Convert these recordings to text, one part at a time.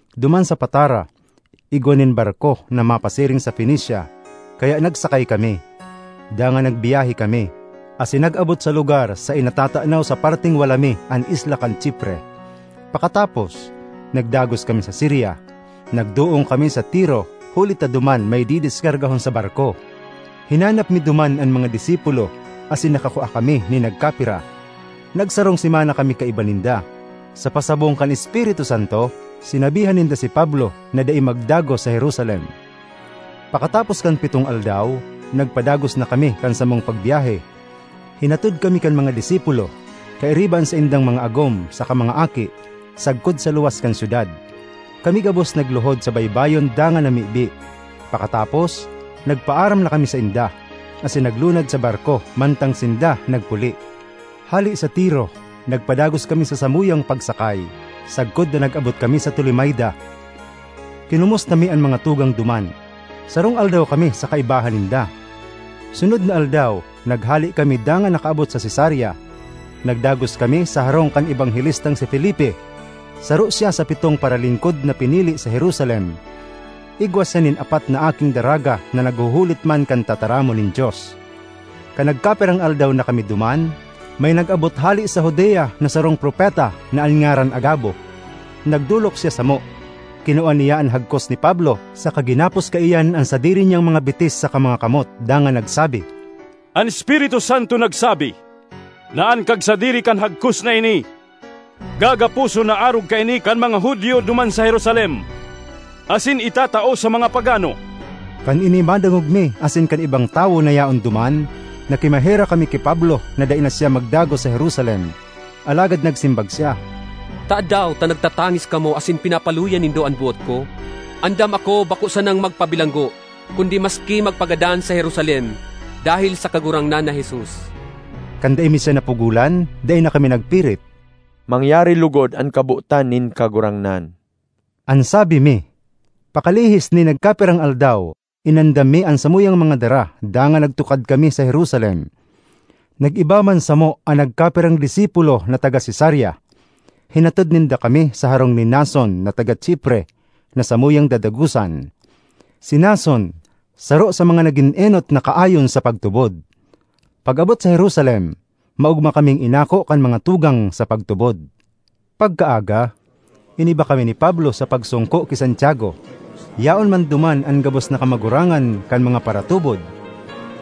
Duman sa Patara igwa nin barko na mapasiring sa Fenecia, kaya nagsakay kami. Dangan nagbiyahe kami, asin nag-abot sa lugar saen natatanaw sa parteng wala mi an isla kan Chipre. Pakatapos, nagdagos kami sa Siria; nagdoong kami sa Tiro huli ta duman may didiskargahon sa barko. Hinanap mi duman an mga disipulo asin nakakua kami nin nagkapira; nagsarong semana kami kaiba ninda. Sa pasabong kan Espiritu Santo, sinabihan ninda si Pablo na dai magdagos sa Jerusalem. Pakatapos kan pitong aldaw, nagpadagos na kami kan samong pagbyahe. Hinatod kami kan mga disipulo, kairiba an saindang mga agom saka mga aki, sagkod sa luwas kan syudad. Kami gabos nagluhod sa baybayon dangan namibi. Pakatapos, nagpaaram na kami sainda, asin naglunad sa barko mantang sinda nagpuli. Hale sa Tiro nagpadagos kami sa samuyang pagsakay, sagkod na nag-abot kami sa Tolemaida. Kinomusta mi an mga tugang duman; sarong aldaw kami sa kaibahan ninda. Sunod na aldaw, naghale kami dangan nakaabot sa Cesarea. Nagdagos kami sa harong kan ebanghelistang si Felipe, saro siya sa pitong paralingkod na pinili sa Jerusalem. Igwa siya nin apat na aking daraga na naghuhulit man kan tataramon nin Dios. Kan nagkapirang aldaw na kami duman, may nag-abot hale sa Judea na sarong propeta na an ngaran Agabo. Nagdolok siya samo, kinua niya an hagkos ni Pablo saka ginapos kaiyan an sadiri niyang mga bitis saka mga kamot dangan nagsabi, “An Espiritu Santo nagsabi na an kagsadiri kan hagkos na ini gagaposon na arog kaini kan mga Judio duman sa Jerusalem, asin itatao sa mga pagano.” Kan ini madangog mi asin kan ibang tawo na yaon duman, nakimaherak kami ki Pablo na dai na siya magdagos sa Jerusalem. Alagad nagsimbag siya, “Tadaw ta nagtatangis kamo asin pinapaluya nindo an boot ko? Andam ako bako sanang magpabilanggo kundi maski magpagadan sa Jerusalem dahel sa Kagurangnan na Jesus.” Kan dai mi siya napugolan, dai na kami nagpirit. “Mangyari logod an kabotan nin Kagurangnan,” an sabi mi. Pakalihis nin nagkapirang aldaw, inandam mi an samuyang mga dara dangan nagtukad kami sa Jerusalem. Nag-iba man samo an nagkapirang disipulo na taga Cesarea; hinatod ninda kami sa harong ni Mnason na taga Chipre na samuyang dadagosan. Si Mnason saro sa mga nagin enot na kaayon sa pagtubod. Pag-abot sa Jerusalem, maogma kaming inako kan mga tugang sa pagtubod. Pagkaaga, iniba kami ni Pablo sa pagsongko ki Santiago; yaon man duman an gabos na kamagurangan kan mga paratubod.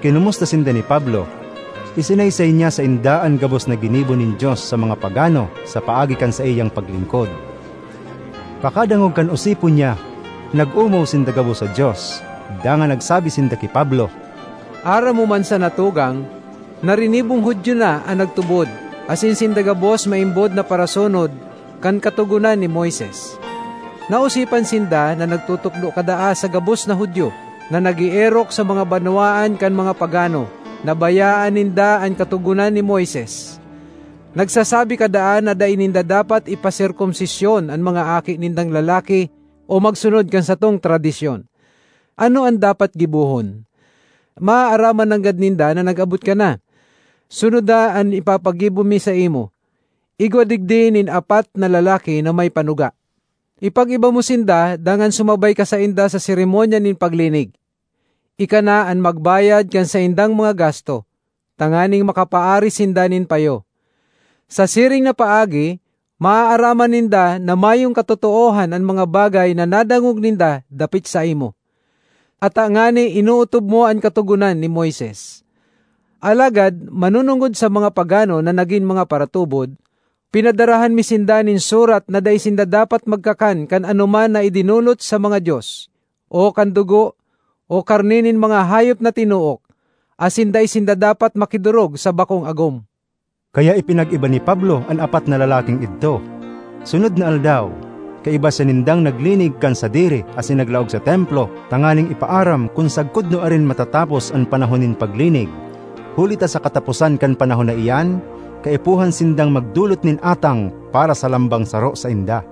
Kinomusta sinda ni Pablo; isinaysay niya sainda an gabos na ginibo nin Dios sa mga pagano sa paagi kan saiyang paglingkod. Pakadangog kan osipon niya, nag-omaw sinda gabos sa Dios. Dangan nagsabi sinda ki Pablo, “Aram mo man sana, tugang, na rinibong Judio na an nagtubod, asin sinda gabos maimbod na parasunod kan Katogonan ni Moises. Naosipan sinda na nagtutukdo ka daa sa gabos na Judio, na nag-eerok sa mga banwaan kan mga pagano, na bayaan ninda an Katogonan ni Moises; nagsasabi ka daa na dai ninda dapat ipaserkomsisyon an mga aki nindang lalaki o magsunod kan satong tradisyon. Ano an dapat gibohon? Maaaraman nanggad ninda na nag-abot ka na. Sunoda an ipapagibo mi saimo: igwa digdi nin apat na lalaki na may panuga. Ipag-iba mo sinda dangan sumabay ka sainda sa seremonya nin paglinig. Ika na an magbayad kan saindang mga gasto, tanganing makapaaris sinda nin payo. Sa siring na paagi, maaaraman ninda na mayong katotoohan an mga bagay na nadangog ninda dapit saimo, ata ngani inootob mo an Katogonan ni Moises. Alagad manonongod sa mga pagano na nagin mga paratubod, pinadarahan mi sinda nin surat na dai sinda dapat magkakan kan anoman na idinolot sa mga dios, o kan dugo, o karne nin mga hayop na tinook, asin dai sinda dapat makidorog sa bakong agom.” Kaya ipinag-iba ni Pablo an apat na lalaking idto; sunod na aldaw, kaiba siya nindang naglinig kan sadiri asin naglaog sa Templo tanganing ipaaram kun sagkod nuarin matatapos an panahon nin paglinig, huli ta sa kataposan kan panahon na iyan, kaipuhan sindang magdolot nin atang para sa lambang saro sainda.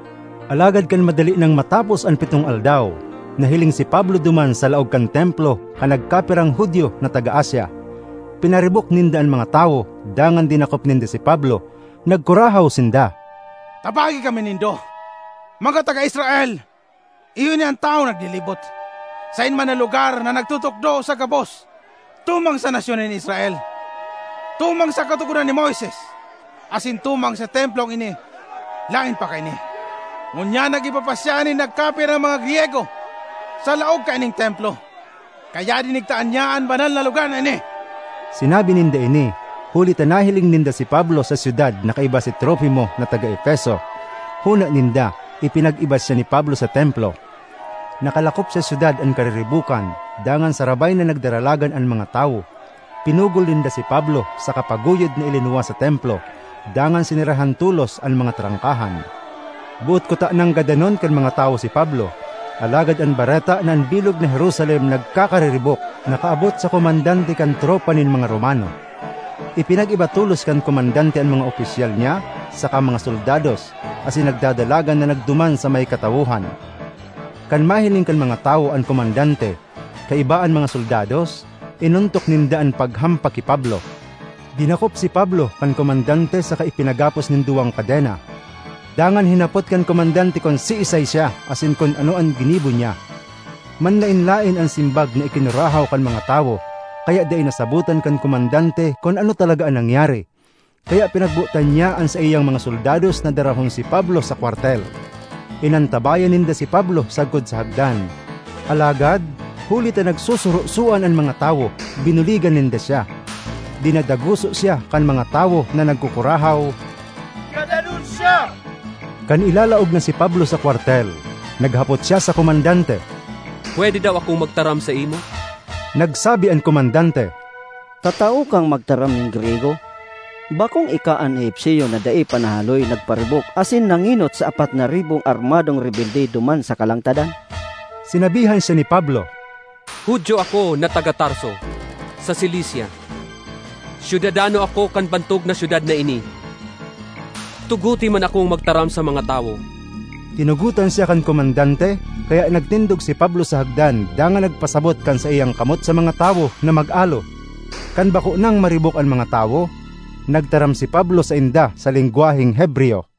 Alagad kan madali nang matapos an pitong aldaw, nahiling si Pablo duman sa laog kan Templo kan nagkapirang Judio na taga Asia. Pinaribok ninda an mga tawo dangan dinakop ninda si Pablo. Nagkurahaw sinda, “Tabangi kami nindo, mga taga Israel! Iyo ini an tawong naglilibot saen man na lugar na nagtutukdo sa gabos tumang sa nasyon nin Israel, tumang sa Katogonan ni Moises asin tumang sa Templong ini. Laen pa kaini, ngunyan nag-iba pa siya nin nagkapirang mga Griyego sa laog kaining Templo kaya dinigtaan niya an banal na lugar na ini!” (Sinabi ninda ini huli ta nahiling ninda si Pablo sa syudad na kaiba si Trofimo na taga Efeso. Hona ninda ipinag-iba siya ni Pablo sa Templo.) Nakalakop sa syudad an kariribokan dangan sarabay na nagdaralagan an mga tawo; pinugol ninda si Pablo saka paguyod na ilinuwas sa Templo. Dangan sinerahan tolos an mga trangkahan. Boot kutanang gadanon kan mga tawo si Pablo, alagad an bareta na an bilog na Jerusalem nagkakariribok nakaabot sa komandante kan tropa nin mga Romano. Ipinag-iba tolos kan komandante an mga opisyal niya saka mga soldados asin nagdadalagan na nagduman sa may katawohan. Kan mahiling kan mga tawo an komandante, kaiba an mga soldados, inontok ninda an paghampak ki Pablo. Dinakop si Pablo kan komandante saka ipinagapos nin duwang kadena. Dangan hinapot kan komandante kun siisay siya asin kun ano an ginibo niya. Manlaen-laen an simbag na ikinurahaw kan mga tawo, kaya dai nasabotan kan komandante kun ano talaga an nangyari. Kaya pinagbotan niya an saiyang mga soldados na darahon si Pablo sa kwartel. Inantabayan ninda si Pablo sagkod sa hagdan, alagad huli ta nagsusurosoan an mga tawo, binuligan ninda siya. Dinadaguso siya kan mga tawo na nagkukurahaw, “Gadanon siya!” Kan ilalaog na si Pablo sa kwartel, naghapot siya sa komandante, “Pwede daw akong magtaram saimo?” Nagsabi an komandante, “Tatao kang magtaram nin Griyego? Bakong ika an Egipcio na dai pa nahahaloy nagparibok asin nangenot sa apat na ribong armadong rebelde duman sa kalangtadan?” Sinabihan siya ni Pablo, “Judio ako na taga Tarso, sa Cilicia. Syudadano ako kan bantog na syudad na ini. Tugote man akong magtaram sa mga tawo.” Tinugotan siya kan komandante, kaya nagtindog si Pablo sa hagdan dangan nagpasabot kan saiyang kamot sa mga tawo na mag-alo. Kan bako nang maribok an mga tawo, nagtaram si Pablo sainda sa lengwaheng Hebreyo: